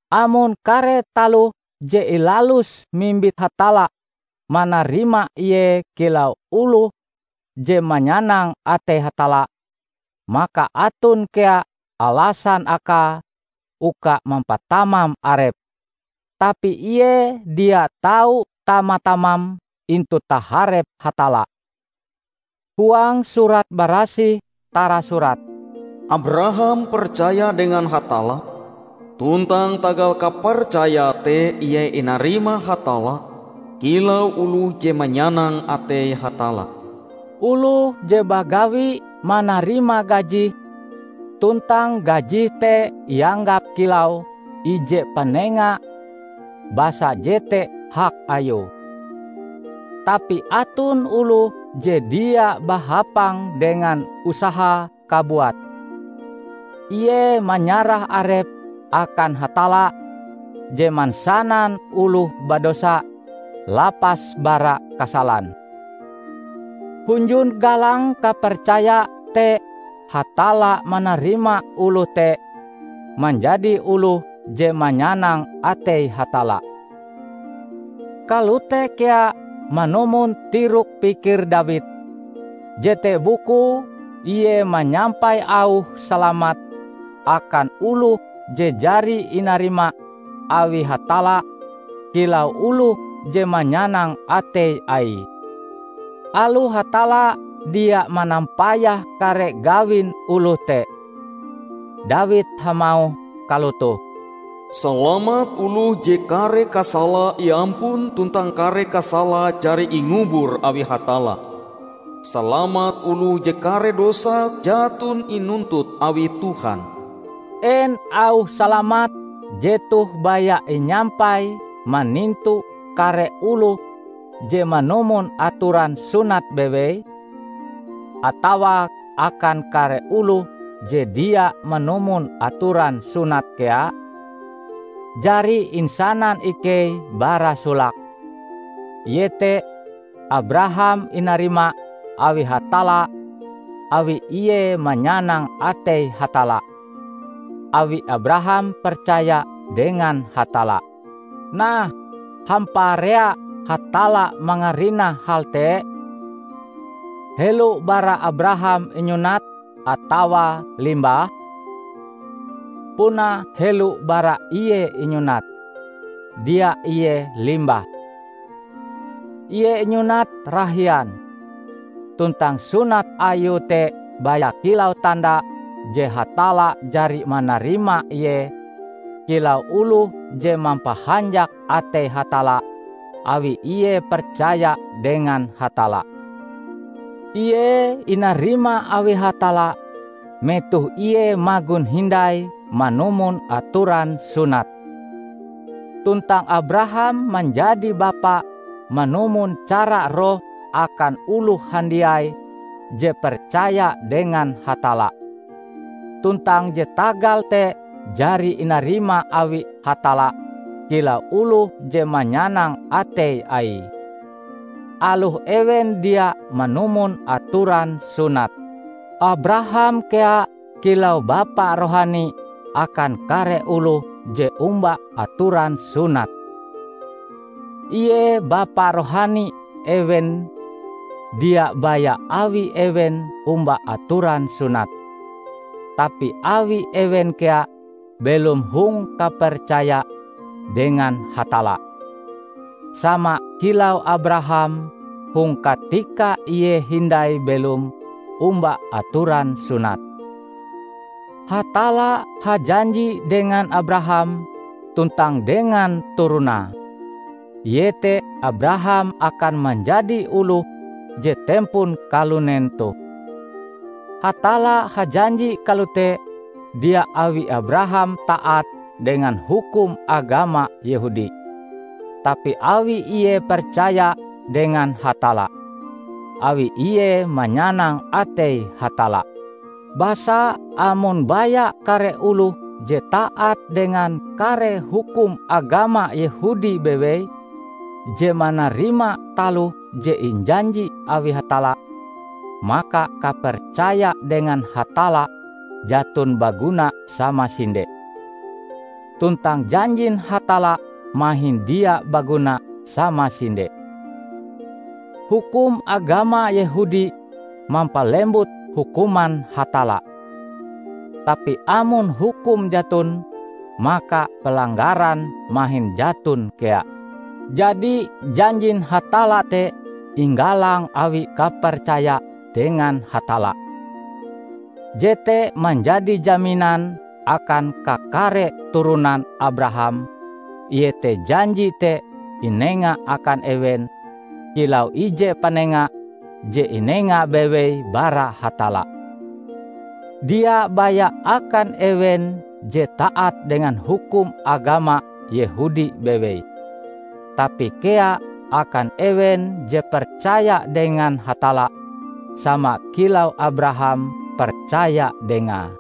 Amon kare taloh je ilaluse mimbit Hatalla manarima ie kilau oloh je manyanang atei Hatalla, maka aton kea alasan akae uka mampatamam arepe. Tapi ie dia tau tama-tamam intu taharep Hatalla. Huang Surat Barasih tarasurat, "Abraham percaya dengan Hatalla, tuntang tagal kapercayae te ie inarima Hatalla kilau oloh je manyanang atei Hatalla." Oloh je bagawi manarima gajih; tuntang gajihe te ianggap kilau ije panenga basa jete hak ayue. Tapi aton oloh je dia bahapang dengan usahae kabuat; ie manyarah arepe akan Hatalla je mansanan oloh badosa lapas bara kasalan. Hunjun galang kapercaya te Hatalla manarima oloh te manjadi oloh je manyanang atei Hatalla. Kalote kea manumon tirok pikir Dawid; jete bukue ie manyampai auh salamat akan oloh je jari inarima awi Hatalla kilau oloh je manyanang atei Aie, aloh Hatalla dia manampayah kare gawin oloh te. Dawid hamauh kalotoh, "Salamat oloh je kare kasalae iampun tuntang kare kasalae jari ingubur awi Hatalla! Salamat oloh je kare dosae jaton inuntut awi Tuhan!" En auh salamat jetoh baya inyampai manintu kare oloh je manumon atoran sunat bewei? Atawa akan kare oloh je dia manumon atoran sunat kea? Jari insanan ikei bara solake, iete Abraham inarima awi Hatalla awi ie manyanang atei Hatalla, awi Abraham percaya dengan Hatalla. Nah, hamparea Hatalla mangarinah hal te? Helo bara Abraham inyunat atawa limbahe? Puna helo bara ie inyunat, dia ie limbahe. Ie inyunat rahian, tuntang sunat ayue te baya kilau tanda je Hatalla jari manarima ie kilau oloh je mampahanjak atei Hatalla awi ie percaya dengan Hatalla. Ie inarima awi Hatalla metoh ie magon hindai manumon atoran sunat. Tuntang Abraham manjadi bapa manumon cara roh akan oloh handiai je percaya dengan Hatalla, tuntang je tagal te jari inarima awi Hatalla kilau oloh je manyanang atei Aie, aloh ewen dia manumon atoran sunat. Abraham kea kilau bapa rohani akan kare oloh je omba atoran sunat. Ie bapa rohani ewen dia baya awi ewen omba atoran sunat, tapi awi ewen kea belom hong kapercaya dengan Hatalla, sama kilau Abraham hong katika ie hindai belom omba atoran sunat. Hatalla hajanji dengan Abraham tuntang dengan turonae, iete Abraham akan manjadi oloh je tempon kalunen toh. Hatalla hajanji kalote dia awi Abraham taat dengan hukum agama Yehudi, tapi awi ie percaya dengan Hatalla, awi ie manyanang atei Hatalla. Basa amon baya kare oloh je taat dengan kare hukum agama Yehudi bewei je manarima taloh je injanji awi Hatalla, maka kapercaya dengan Hatalla jaton baguna samasinde, tuntang janjin Hatalla mahin dia baguna samasinde. Hukum agama Yehudi mampalembut hukuman Hatalla. Tapi amon hukum jaton, maka pelanggaran mahin jaton kea. Jadi janjin Hatalla te inggalang awi kapercaya dengan Hatalla. Jete manjadi jaminan akan kakare turonan Abraham iete janji te inenga akan ewen kilau ije panenga je inenga bewei bara Hatalla; dia baya akan ewen je taat dengan hukum agama Yehudi bewei, tapi kea akan ewen je percaya dengan Hatalla sama kilau Abraham percaya Dengae.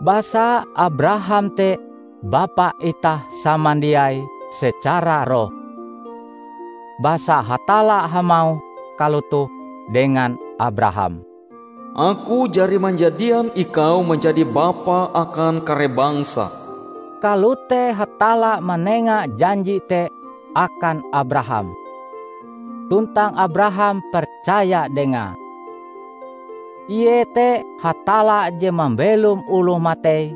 Basa Abraham te bapa itah samandiai secara roh. Basa Hatalla hamauh kalotoh dengan Abraham, "Aku jari manjadian ikau manjadi bapa akan kare bangsa." Kalote Hatalla manenga janji te akan Abraham. Tuntang Abraham percaya Dengae. Ie te Hatalla je mambelom oloh matei;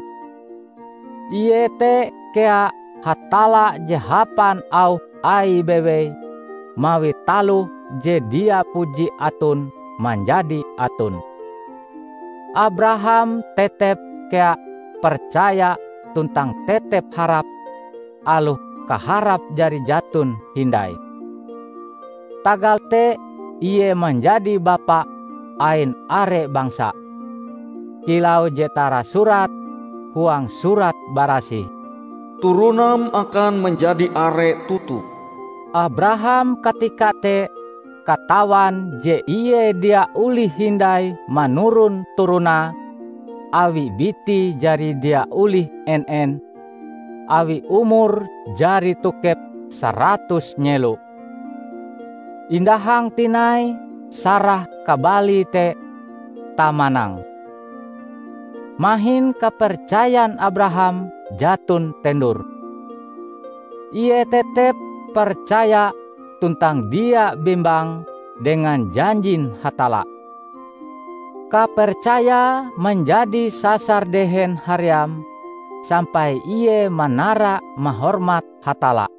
ie te kea Hatalla je hapan auh Aie bewei mawi taloh je dia puji aton manjadi aton. Abraham tetep kea percaya tuntang tetep harap aloh kaharap jari jaton hindai. Tagal te ie manjadi bapa ain are bangsa. Kilau je tarasurat huang Surat Barasih, "Turonam akan manjadi are toto." Abraham katika te katawan je ie dia olih hindai manuron turonae awi bitie jari dia olih en-en, awi umure jari tokep saratus nyelo, indahang tinai Sarah kabalie te tamanang. Mahin kapercayan Abraham jaton tendur. Ie tetep percaya tuntang dia bembang dengan janjin Hatalla. Kapercayae manjadi sasar dehen haream, sampai ie manara-mahormat Hatalla.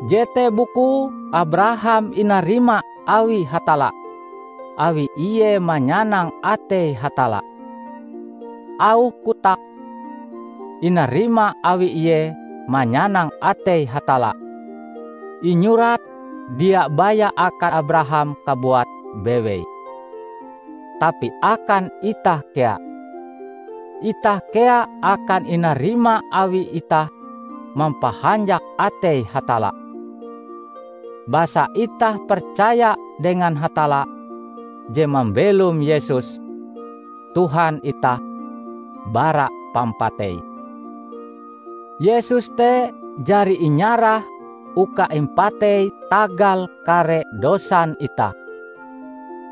Jete bukue Abraham inarima awi Hatalla awi ie manyanang atei Hatalla. Auh kotak, "Inarima awi ie manyanang atei Hatalla" inyurat dia baya akan Abraham kabuate bewei, tapi akan itah kea. Itah kea akan inarima awi itah mampahanjak atei Hatalla, basa itah percaya dengan Hatalla je mambelom Yesus, Tuhan itah, bara pampatei. Yesus te jari inyarah uka impatei tagal kare dosan itah;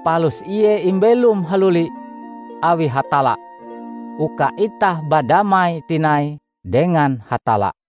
palus Ie imbelom haluli awi Hatalla uka itah badamai tinai dengan Hatalla.